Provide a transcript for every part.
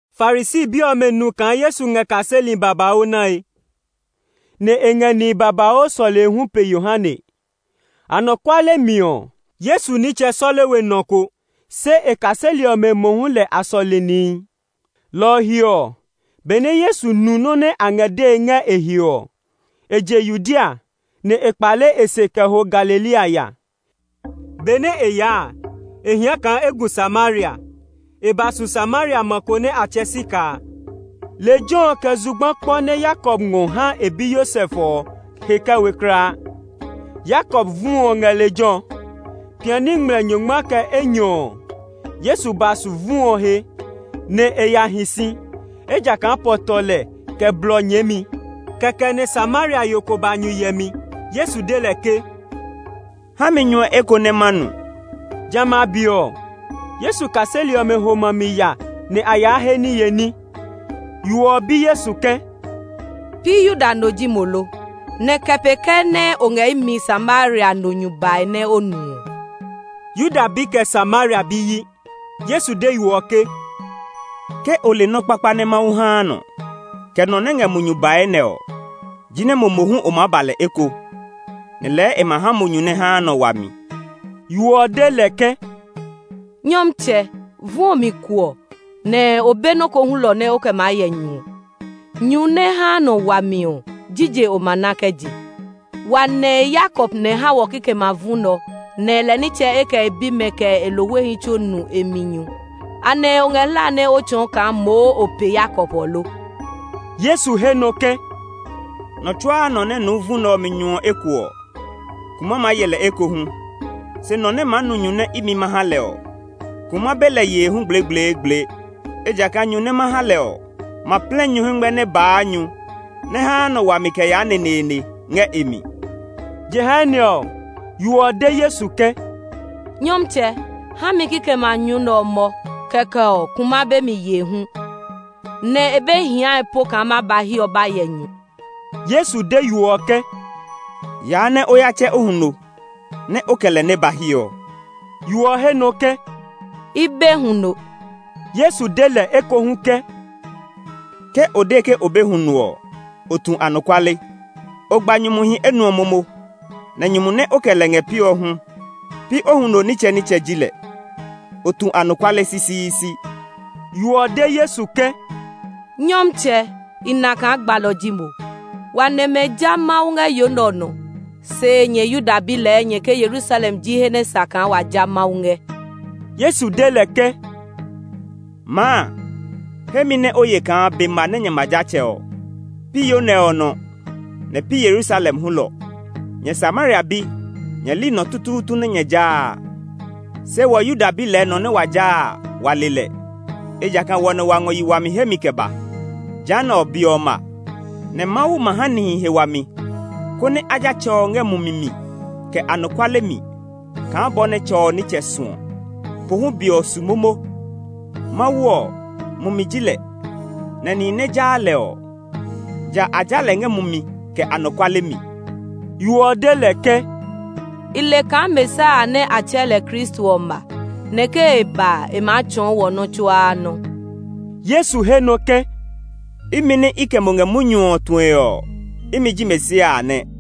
Farisi bi ɔmɛ nu kaa Yesu ngɛ kaseli babauu nae, nɛ e ngɛ nihi babauu sɔlee hu pe Yohane. (Anɔkuale mi ɔ, Yesu nitsɛ sɔle we nɔ ko, se e kaseli ɔmɛ mohu lɛ a sɔle nihi.) Lɔ ɔ he ɔ, benɛ Yesu nu nɔ́ nɛ a ngɛ dee ngɛ e he ɔ, e je Yudea, nɛ e kpale e se kɛ ho Galilea ya. Benɛ e yaa a, e hia kaa e gu Samaria. E ba su Samaria ma ko nɛ a tsɛɛ Sikar a. Lejɛ ɔ kɛ zugba kpɔ nɛ Yakob ngɔ ha e bi Yosef ɔ he kɛ we kulaa. Yakob vu ɔ ngɛ lejɛ ɔ. Piani ngmlɛ nyɔngma kɛ enyɔ ɔ, Yesu ba su vu ɔ he, nɛ e ya hi si, ejakaa pɔ tɔ lɛ kɛ blɔ nyɛɛmi. Kɛkɛ nɛ Samaria yo ko ba nyu yɛmi. Yesu de lɛ ke, “Ha mi nyu ɔ eko nɛ ma nu.” (Jamɛ a be ɔ, Yesu kaseli ɔmɛ sɛ ma a mi ya nɛ a yaa he niye ní.) Yo ɔ bi Yesu ke, “Pi Yuda no ji mo lo? Nɛ kɛ pee kɛɛ nɛ o ngɛ imi Samaria no nyu bae nɛ o nu ɔ?” (Yuda bi kɛ Samaria bi yi.) Yesu de yo ɔ ke, “Ke o le nɔ́ kpakpa nɛ Mawu haa nɔ, kɛ nɔ nɛ ngɛ mo nyu bae nɛ ɔ, jinɛ mo mohu o maa ba lɛ eko, nɛ lɛɛ e ma ha mo nyu nɛ haa nɔ wami.” Yo ɔ de lɛ ke, “Nyɔmtsɛ, vu ɔ mi kuɔ, nɛ o be nɔ́ ko hulɔ nɛ o kɛ maa yɛ nyu ɔ. Nyu nɛ haa nɔ wami ɔ, jije o ma ná kɛ je? Wa nɛ̃ Yakob nɛ ha wɔ kikɛmɛ a vu nɛ ɔ; nɛ lɛ nitsɛ, kɛ e bimɛ, kɛ e lohwehi tsuo nu e mi nyu. Anɛ o ngɛ hlae nɛ o tsɔɔ kaa moo o pe Yakob ɔ lo?” Yesu he nɔ ke, “Nɔ tsuaa nɔ nɛ nuu vu nɛ ɔ mi nyu ɔ eko ɔ, kuma maa ye lɛ ekohu, se nɔ nɛ maa nu nyu nɛ imi ma ha lɛ ɔ, kuma be lɛ yee hu gblegbleegble. Ejakaa nyu nɛ ma ha lɛ ɔ ma plɛ nyu hɛngmɛ nɛ baa nyu nɛ haa nɔ wami kɛ yaa neneene ngɛ e mi.” Jehanɛ ɔ, yo ɔ de Yesu ke, “Nyɔmtsɛ, ha mi kikɛmɛ a nyu nɛ ɔ mɔ, kɛkɛ ɔ, kuma be mi yee hu, nɛ e be hiae po kaa ma ba hiɛ ɔ ba yɛ nyu.” Yesu de yo ɔ ke, “Yaa nɛ o ya tsɛ o huno, nɛ o kɛ lɛ nɛ ba hiɛ ɔ.” Yo ɔ he nɔ ke, “I be huno.” Yesu de lɛ ekohu ke, “Ke o de ke o be huno ɔ, o tu anɔkuale. O gba nyumuhi enuɔ momo, nɛ nyumu nɛ o kɛ lɛ ngɛ piɔ hu, pi o huno nitsɛnitsɛ ji lɛ. O tu anɔkuale sisiisi.” Yo ɔ de Yesu ke, “Nyɔmtsɛ, i na kaa gbalɔ ji mo. Wa nɛmɛ ja Mawu ngɛ yo nɛ ɔ nɔ, se nyɛ Yuda bi lɛɛ nyɛ ke Yerusalem ji he nɛ sa kaa wa ja Mawu ngɛ.” Yesu de lɛ ke, “Maa, he mi nɛ o ye kaa be ma nɛ nyɛ ma ja Tsɛ ɔ, pi yo nɛ ɔ nɔ, nɛ pi Yerusalem hulɔ. Nyɛ Samaria bi, nyɛ li nɔ tutuutu nɛ nyɛ jaa a; se wɔ Yuda bi lɛɛ nɔ nɛ wa jaa a, wa le lɛ; ejakaa wɔ nɛ wa ngɔ yi wami hemi kɛ ba. Jehanɛ ɔ, be ɔ ma, nɛ Mawu ma ha nihi he wami, konɛ a ja Tsɛ ɔ ngɛ mumi mi kɛ anɔkuale mi kaa bɔ nɛ Tsɛ ɔ nitsɛ suɔ. Pohu be ɔ su momo. Mawu ɔ, Mumi ji lɛ, nɛ nihi nɛ jaa lɛ ɔ, ja a ja lɛ ngɛ mumi kɛ anɔkuale mi.” Yo ɔ de lɛ ke, “I le kaa Mesia a nɛ a tsɛɛ lɛ Kristo ɔ ma, nɛ ke e ba a, e maa tsɔɔ wɔ nɔ́ tsuaa nɔ́.” Yesu he nɔ ke, “Imi nɛ i kɛ mo ngɛ munyu ɔ tue ɔ, imi ji Mesia a nɛ.”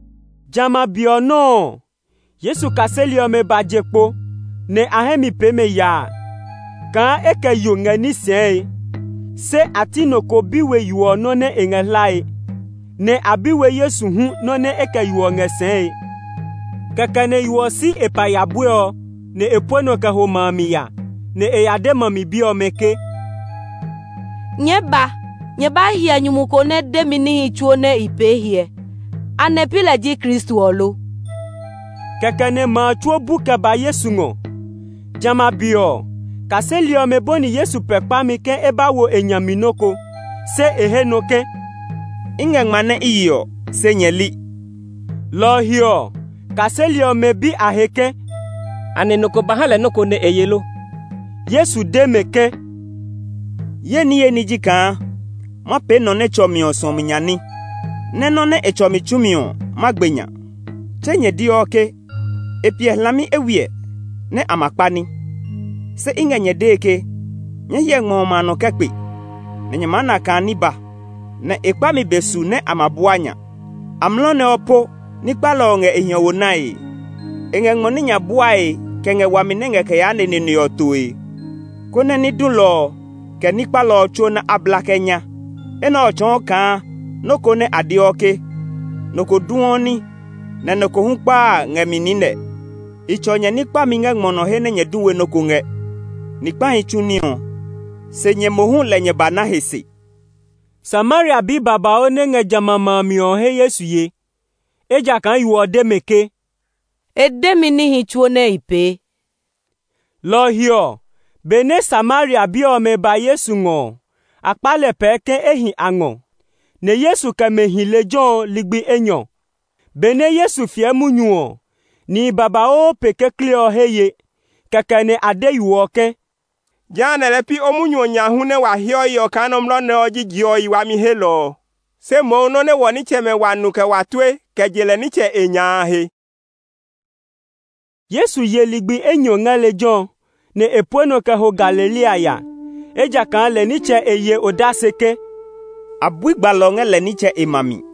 Jamɛ a be ɔ nɔuu ɔ, Yesu kaseli ɔmɛ ba je kpo, nɛ a hɛ mi pee mɛ yaa kaa e kɛ yo ngɛ ní sɛɛe. Se a ti nɔ ko bi we yo ɔ nɔ́ nɛ e ngɛ hlae; nɛ a bi we Yesu hu nɔ́ nɛ e kɛ yo ɔ ngɛ sɛɛe. Kɛkɛ nɛ yo ɔ si e paya buɛ ɔ, nɛ e pue nɔ kɛ ho ma a mi ya; nɛ e ya de ma mi bi ɔmɛ ke, “Nyɛɛ ba! Nyɛ ba hyɛ nyumu ko nɛ de mi níhi tsuo nɛ i pee hyɛ. Anɛ pi lɛ ji Kristo ɔ lo?” Kɛkɛ nɛ ma a tsuo bu kɛ ba Yesu ngɔ. Jamɛ a be ɔ, kaseli ɔmɛ bɔni Yesu pɛɛ kpami ke e ba wo e nya mi nɔ́ ko. Se e he nɔ ke, “I ngɛ ngma nɛ i yeɔ, se nyɛ li.” Lɔ ɔ he ɔ, kaseli ɔmɛ bi a he ke, “Anɛ nɔ ko ba ha lɛ nɔ́ ko nɛ e ye lo?” Yesu de mɛ ke, “Ye niye ní ji kaa ma pee nɔ nɛ tsɔ mi ɔ suɔmi nya ní; nɛ́ nɔ́ nɛ e tsɔ mi tsumi ɔ, ma gbe nya. Tse nyɛ deɔ ke, ‘E piɛ hlami eywiɛ nɛ a ma kpa ní.’ Se i ngɛ nyɛ dee ke, nyɛɛ hyɛ ngmɔ ɔmɛ a nɔ kɛ kpe, nɛ nyɛ maa na kaa ní ba, nɛ e kpami be su nɛ a ma bua nya. Amlɔ nɛ ɔ po ní kpalɔ ɔ ngɛ e hiɔwo nae; e ngɛ ngmɔ ní nya buae kɛ ngɛ wami nɛ ngɛ kɛ yaa neneene ɔ toe, konɛ ní dulɔ ɔ, kɛ ní kpalɔ ɔ tsuo nɛ a bla kɛ nya. Enɛ ɔ tsɔɔ kaa nɔ́ ko nɛ a deɔ ke, ‘Nɔ ko duɔ ní, nɛ nɔ ko hu kpaa’ a ngɛ mi niinɛ. I tsɔ nyɛ ní kpami ngɛ ngmɔ nɔ he nɛ nyɛ du we nɔ́ ko ngɛ. Ni kpahi tsu ní ɔ, se nyɛ mohu lɛ nyɛ ba na he se.” Samaria bi babauu nɛ ngɛ jamɛ a ma a mi ɔ he Yesu ye, ejakaa yo ɔ de mɛ ke, “E de mi níhi tsuo nɛ i pee.” Lɔ ɔ he ɔ, benɛ Samaria bi ɔmɛ ba Yesu ngɔ ɔ, a kpa lɛ pɛɛ ke e hi a ngɔ. Nɛ Yesu kɛ mɛ hi lejɛ ɔ ligbi enyɔ. Benɛ Yesu fiɛ munyu ɔ, nihi babauu pe kekle ɔ he ye. Kɛkɛ nɛ a de yo ɔ ke, “Jehanɛ lɛɛ pi o munyu ɔ nya hu nɛ wa heɔ yeɔ kaa nɔmlɔ nɛ ɔ ji je ɔ yi wami helɔ ɔ, se mohu nɔ́ nɛ wɔ nitsɛmɛ wa nu kɛ wa tue kɛ je lɛ nitsɛ e nya a he.” Yesu ye ligbi enyɔ ngɛ lejɛ ɔ, nɛ e pue nɔ kɛ ho Galilea ya, ejakaa lɛ nitsɛ e ye odase ke, “A bui gbalɔ ngɛ lɛ nitsɛ e ma mi.”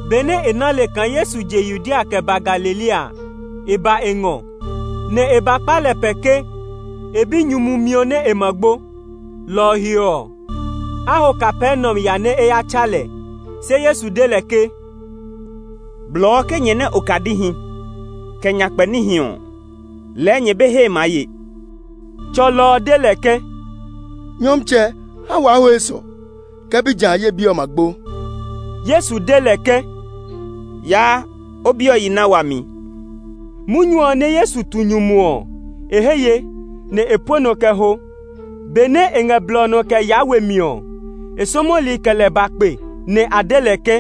Benɛ e ná le kaa Yesu je Yudea kɛ ba Galilea a, e ba e ngɔ, nɛ e ba kpa lɛ pɛɛ ke e binyumu miɔ nɛ e ma gbo, lɔ ɔ he ɔ, a ho Kapernaum ya nɛ e ya tsa lɛ. Se Yesu de lɛ ke, “Blɔɔ ke nyɛ nɛ okadihi, kɛ nyakpɛ níhi ɔ, lɛɛ nyɛ be hee maa ye!” Tsɔlɔ ɔ de lɛ ke, “Nyɔmtsɛ, ha waa ho esɔ, ke pi ja a, ye bi ɔ ma gbo.” Yesu de lɛ ke, “Yaa, o bi ɔ yi na wami.” Munyu ɔ nɛ Yesu tu nyumu ɔ, e he ye, nɛ e pue nɔ kɛ ho. Benɛ e ngɛ blɔ ɔ nɔ kɛ yaa we mi ɔ, e sɔmɔli kɛ lɛ ba kpe; nɛ a de lɛ ke,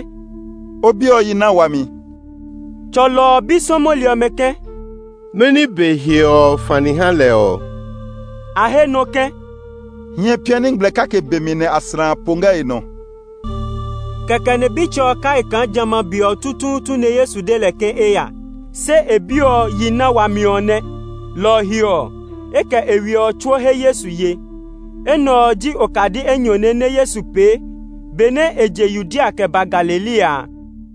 “O bi ɔ yi na wami.” Tsɔlɔ ɔ bi sɔmɔli ɔmɛ ke, “Mɛni be hiɔ ɔ fani ha lɛ ɔ?” A he nɔ ke, “Hiɛ̃ piani ngmlɛ kake be mi nɛ aslã a po ngɛ e nɔ.” Kɛkɛ nɛ bitsɛ ɔ kai kaa jamɛ a be ɔ tutuutu nɛ Yesu de lɛ ke e ya, se e bi ɔ yi na wami ɔ nɛ. Lɔ ɔ he ɔ, e kɛ e we ɔ tsuo he Yesu ye. Enɛ ɔ ji okadi enyɔne nɛ Yesu pee benɛ e je Yudea kɛ ba Galilea a.